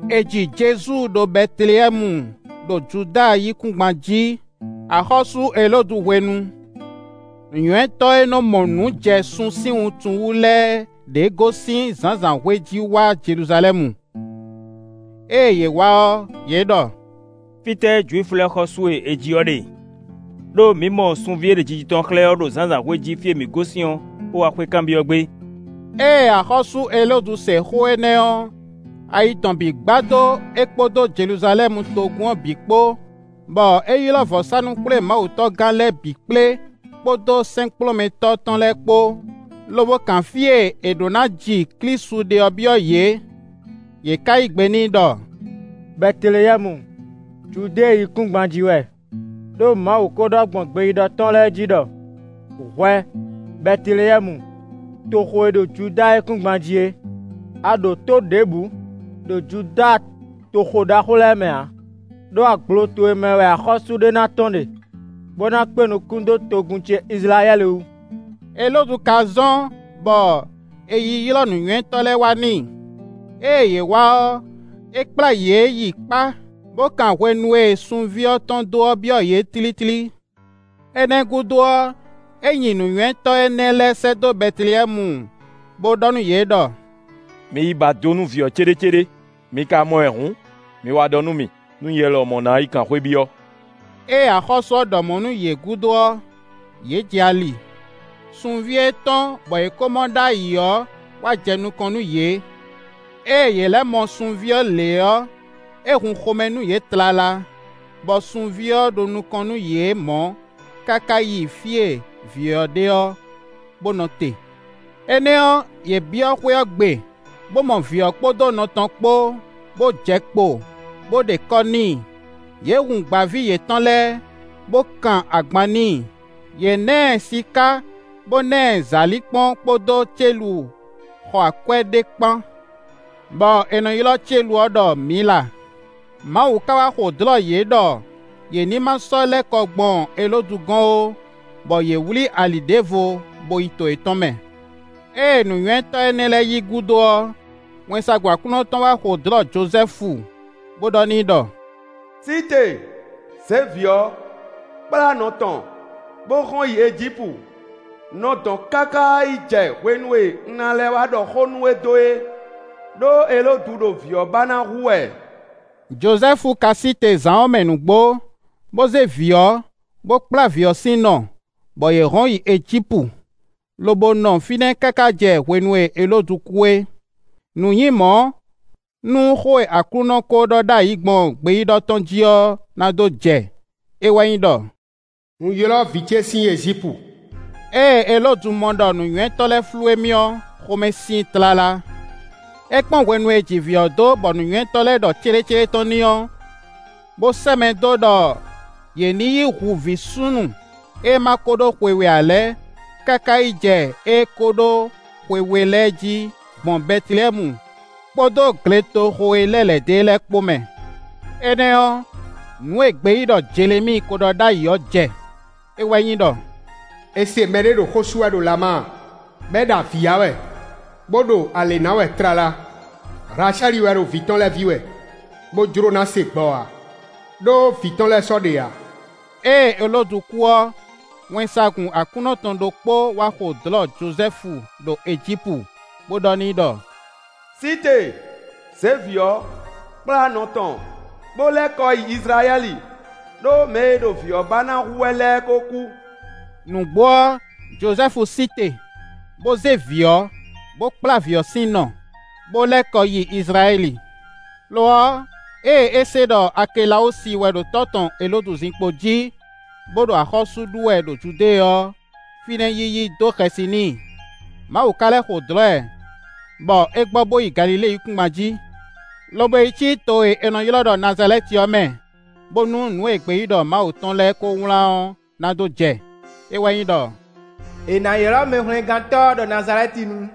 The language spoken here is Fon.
È ji Jezu ɖo Bɛteleyɛ́mu ɖo Juda yíkúngban jí, axɔ́sú Elódu hwenu; nǔnywɛ́tɔ́ e nɔ́ mɔ nǔ jɛ sun sín wuntun wú lɛ́ɛ ɖěe gosín zǎnzǎnhwe jí wá Jeluzalɛ́mu. Ée yě wá ɔ́, yě ɖɔ: “Fítɛ́ Jwifu lɛ́ɛ xɔ́sú e è ji ɔ́ ɖe? Ɖó mǐ mɔ sunví e ɖe jiji tɔn xlɛ́ ɔ́ ɖo zǎnzǎnhwe jí fí e mǐ gosín ɔ́, bó wá xwé kanbyɔ́ gbé.” Ée axɔ́sú Elódu se xó énɛ́ ɔ́, ayi tɔn bǐ gbadó é kpódó Jeluzalɛ́mu togun ɔ́ bǐ kpó, bɔ é ylɔ́ vɔ̌sánú-xwlémawutɔ́gán lɛ́ɛ bǐ kplé kpódó sɛ́nkplɔ́nmɛtɔ́ tɔn lɛ́ɛ kpó, lobo kan fí e è ɖǒ ná ji Klísu ɖe ɔ́ byɔ́ yě. Yě ká yí gbe n'i ɖɔ: “Bɛteleyɛ́mu, Judée yíkúngban jí wɛ, ɖó Mawu kó ɖɔ gbɔn gbeyíɖɔ tɔn lɛ́ɛ jí ɖɔ: ‘Hwɛ, Bɛteleyɛ́mu, toxo e ɖo Juda yíkúngban jí é! A ɖo tó ɖěbǔ ɖo Juda toxo ɖaxó lɛ́ɛ mɛ ǎ, ɖó agblo towe mɛ wɛ axɔ́sú ɖé ná tɔ́n ɖe, bó ná kpé nukún dó togun ce Izlayɛ́li wú.’” Elódu ka zɔ́n, bɔ è yi ylɔ́ nǔnywɛ́tɔ́ lɛ́ɛ wá n'i. Ée yě wá ɔ́, é kplá yě yi kpá, bo kan hwenu e sunví ɔ́ tɔ́n dó ɔ́ byɔ́ yě tlítlí. Énɛ́ gúdo ɔ́, é nyi nǔnywɛ́tɔ́ énɛ́ lɛ́ɛ sɛ́ dó Bɛteleyɛ́mu bó ɖɔ nú yě ɖɔ: “Mi yi ba do nú vǐ ɔ́ céɖécéɖé, mi ka mɔ ɛ hǔn, mi wá ɖɔ nú mì, nú nyɛ lɔmɔ̌ ná yi kan xwé byɔ́.” Ée axɔ́sú ɔ́ ɖɔ mɔ̌ nú yě gúdo ɔ́, yě jɛ ali. Sunví e tɔ́n bɔ yě kó mɔ ɖ'ayǐ ɔ́ wá jɛ nukɔn nú yě. Ée yě lɛ́ mɔ sunví ɔ́ lě ɔ́, é hun xomɛ nú yě tlala, bɔ sunví ɔ́ ɖo nukɔn nú yě mɔ̌, káká yi fí e vǐ ɔ́ ɖe ɔ́, bó nɔ te. Énɛ́ ɔ́, yě byɔ́ xwé ɔ́ gbe, bó mɔ vǐ ɔ́ kpódó nɔ tɔn kpó, bó jɛ kpo, bó ɖe kɔ́ n'i; yě hun gbǎví yětɔn lɛ́ɛ, bó kan agban n'i; yě ná ɛ siká, bó ná ɛ zǎlínkpɔ́n kpódó célu xɔ akwɛ́ ɖé kpán, bɔ è nɔ ylɔ́ célu ɔ́ ɖɔ Mǐla. Mawu ka wá xo dlɔ̌ yě ɖɔ yě ní ma sɔ́ lɛ́ kɔ gbɔn Elódu gɔ́n ó; bɔ yě wlí ali ɖěvo bo yi to yětɔn mɛ. Ée nǔnywɛ́tɔ́ énɛ́ lɛ́ɛ yi gúdo ɔ́, wɛnsagun Aklúnɔ tɔn wá xo dlɔ̌ Jozɛ́fu bó ɖɔ n'i ɖɔ: “Sí te, zě vǐ ɔ́, kplá nɔ tɔn, bó hɔn yi Ejípu; nɔ dɔ̌n káká yi jɛ hwenu e un ná lɛ́ wá ɖɔ xó nú we dó é. Ɖó Elódu ɖo vǐ ɔ́ ba ná hu wɛ.” Jozɛ́fu ka sí te zǎn ɔ́ mɛ nǔgbó, bó zé vǐ ɔ́, bó kplá vǐ ɔ́ sín nɔ, bɔ yě hɔn yi Ejípu, lobo nɔ fínɛ́ káká jɛ hwenu e Elódu kú é. Nǔ nyí mɔ̌, nú xó e Aklúnɔ ko ɖɔ ɖ'ayǐ gbɔn gbeyíɖɔ tɔn jí ɔ́ ná dó jɛ; é wɛ nyí ɖɔ: “Un ylɔ́ vǐ ce sín Ejípu.” Ée Elódu mɔ ɖɔ nǔnywɛ́tɔ́ lɛ́ɛ flú émí ɔ́, xomɛ sin i tlala. É kpɔ́n hwenu e è ji vǐ ɔ́ dó bɔ nǔnywɛ́tɔ́ lɛ́ɛ ɖɔ céɖécéɖé tɔn n'i ɔ́, bó sɛ́ mɛ dó ɖɔ yě nǐ yi hu vǐ súnnu e ma ko ɖó xwe we ǎ lɛ́ɛ káká yi jɛ ée kó ɖó xwe we lɛ́ɛ jí gbɔn Bɛteleyɛ́mu kpódó gletoxo e lɛ́ lɛ̌ dó e lɛ́ɛ kpó mɛ. Énɛ́ ɔ́, nǔ e gbeyíɖɔ Jelemíi kó ɖɔ ɖ'ayǐ ɔ́ jɛ; é wɛ nyí ɖɔ: “È se mɛɖé ɖo xó sú wɛ ɖo Lama, bɔ é ɖo avǐ ya wɛ, bó ɖo alě ná wɛ tlala; Hlacɛ́li wɛ ɖo vǐ tɔn lɛ́ɛ ví wɛ, bó jló ná se gbɔ ǎ, ɖó vǐ tɔn lɛ́ɛ sɔ́ ɖe ǎ.” Ée Elódu kú ɔ́, wɛnsagun Aklúnɔ tɔn ɖokpó wá xo dlɔ̌ Jozɛ́fu ɖo Ejípu, bó ɖɔ n'i ɖɔ: “Sí te; zě vǐ ɔ́, kplá nɔ tɔn, bó lɛ́ kɔ yi Izlayɛ́li; ɖó mɛ e ɖo vǐ ɔ́ ba ná hu wɛ lɛ́ɛ kó kú.” Nǔgbó ɔ́, Jozɛ́fu sí te, bó zé vǐ ɔ́, bó kplá vǐ ɔ́ sín nɔ, bó lɛ́ kɔ yi Izlayɛ́li. Lo ɔ́, ée é se ɖɔ Akelawúsi wɛ ɖo tɔ́ tɔn Elódu zinkpo jí, bó ɖo axɔ́sú ɖu wɛ ɖo Judée ɔ́, fínɛ́ yiyi dó xɛsi n'i; Mawu ka lɛ́ xo dlɔ̌ ɛ, bɔ é gbɔ bó yi Galilée yíkúngban jí, lobo yi cí to e è nɔ ylɔ́ ɖɔ Nazalɛ́ti ɔ́ mɛ, bónú nǔ e gbeyíɖɔ Mawu tɔn lɛ́ɛ kó wlán ɔ́ ná dó jɛ, é wɛ nyí ɖɔ: “È nǎ ylɔ́ Mɛhwlɛ́ngántɔ́ ɔ́ ɖɔ Nazalɛ́tinu.”